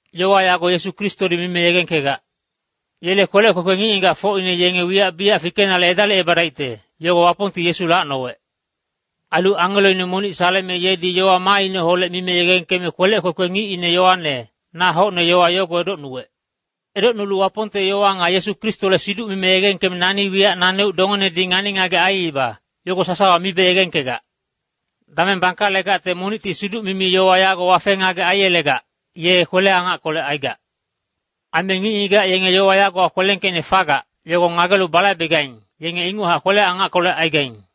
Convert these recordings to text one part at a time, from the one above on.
Yowa yago Yesu Kristodi mime yegengkegac. Yele kwelec kwekwe ngic-ngigacfocine yenge wiyac biyac fikenale edalicebadaicte, yogo Wapongti Yesu lacnowec. Ailu angeloine monic saleme yedi yowa maaineholec mime yegengkeme kwelec kwekwe ngicine Yoane, na hocne yowa yogo edocnuwec. Edocnulu Wapongte yowa nga Yesu Kristole siduc mime yegengkeme nani wiyac naneuc dongenedi ngani-ngagec aiiba, yogo sasawa mibe yegengkegac. Dameng bangkalegacte monicti Wapongte siduc-yowa yago wafe-ngagec aiyelegac, ye kwele-angackolec aigac. Aime ngic-ngigac yenge yowa yagowa kwelengkeicne fagac, yogo ngagelu balaibegaing, yenge inguchac kwele-angackolec aigaing.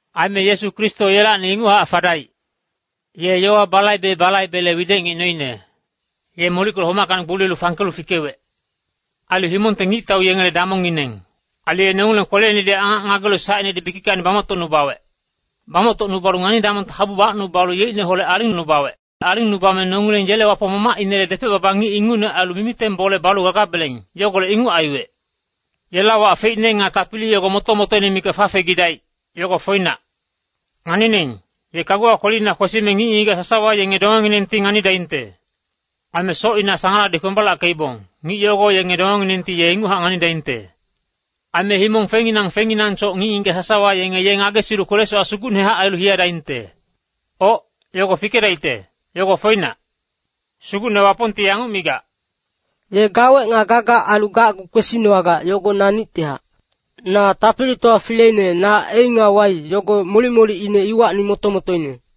Aime Yesu Kristo yelacni inguchac fadaic. Ye yowa balaibe-balaibele widec ngic noine. Ye molickenolelu homackacni gboliyelu fangkelu fikewec. Ailu himongte ngictau yengele damongngineng. Ailu ye nongileng kweleinedi angac ngagelu sacinedi bikickacni bamoctocnubawec. Bamoctocnubalu ngani-damongte habu bacnubalu yeicneholec alingnubawec. Alingnubame nongileng yele Wapong Mamacinele depec-baba ngic ingucne ailu mimiteng bole balu gagabeleng, yogolec inguc aiwec. Yela wac feicne nga tapili yogo moto-motoine mikac fafegidaic, yogo foinac. Nganining, ye kaguwa kwelina kwesime ngic-ngigac sasawa yenge dongenginengti nganidaingte. Aime socina sangaladi kwembalackeibong, ngic yogo yenge dongenginengti ye inguchac nganidaingte. Aime himong fengnginang fengnginangsoc ngic-ngigac sasawa yenge ye ngagesilu kwele-sowac sugucnehac ailu hiyadaingte. Oc, yogo fikedaicte, yogo foinac. Sugucne Wapongti yanguc migac, “Ye gawec nga gagac ailu gacgu kwesinowagac, yogo naneuctihac. Na Tapilitowa Fileine, na ‘A’ nga ‘Y’, yogo molic-molicine iwacni moto-motoine.”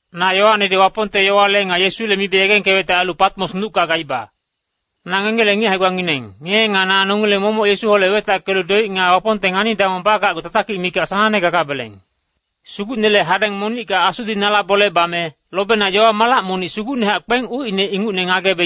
Na Yoanedi Wapongte yowale nga Yesule mibe yegengkewecte ailu Patmos nucka gaiba. Na ngengele ngic hae-gbangineng, ngenge nga na nongileng momoc Yesuholec wetackelu doic nga Wapongte ngani-damong bagacgu tatakic mikac sanangne gagabeleng. Sugucnele hadeng monicka Asudi nala bole bame, lobena yowa-malac monic sugucnehac kpeng ucine ingucne ngagebe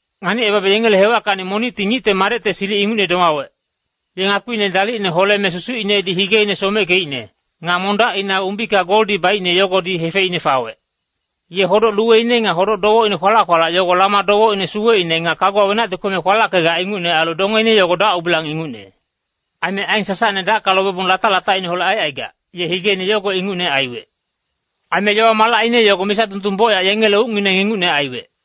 Nganicebabe yengele hewackacni monicti Ngicte Madecte silic ingucne domawec. Ye ngakpiine dalicne holeme susucinedi higeine someckeicne, nga mondacina umbika goldi baicne yogodi hefeicne fawec. Ye hodoc-luweine nga hodoc-dowecine kwalac-kwalac yogo lama dowecine suweicne nga kaguwa wenacti kweme kwalackegac ingucne ailu dongeine yogo dac-ubilang ingucne. Aime aen sasacne dacka lobebong latac-latacineholec aicaigac, ye higeine yogo ingucne aiwec. Aime yowa-malacine yogo misa dundung bocyac yengele ucngineng ingucne aiwec.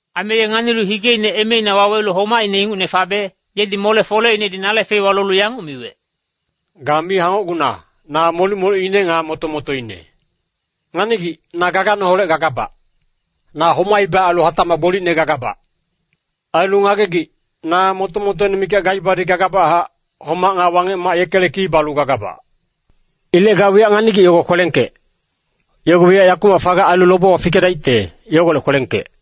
Aime ye nganilu higeine emeina wawelu homaicne ingucne fabe, yedi mole-foleinedi nale feiwa lolu yanguc miwec, “Ga mi hangocguna, na molic-molicine nga moto-motoine. Nganigic, na gaganeholec gagabac. Na homaiba ailu hatacmac gbolicne gagabac. Ailu ngagegic, na moto-motoine mikac gaibadi gagabachac, homac nga Wangec-mac yekele ki balu gagabac. “Ilec ga wiyac nganigic yogo kwelengkec. Yogo wiyac yakumac fagac ailu lobewa fikedaicte, yogolec kwelengkec.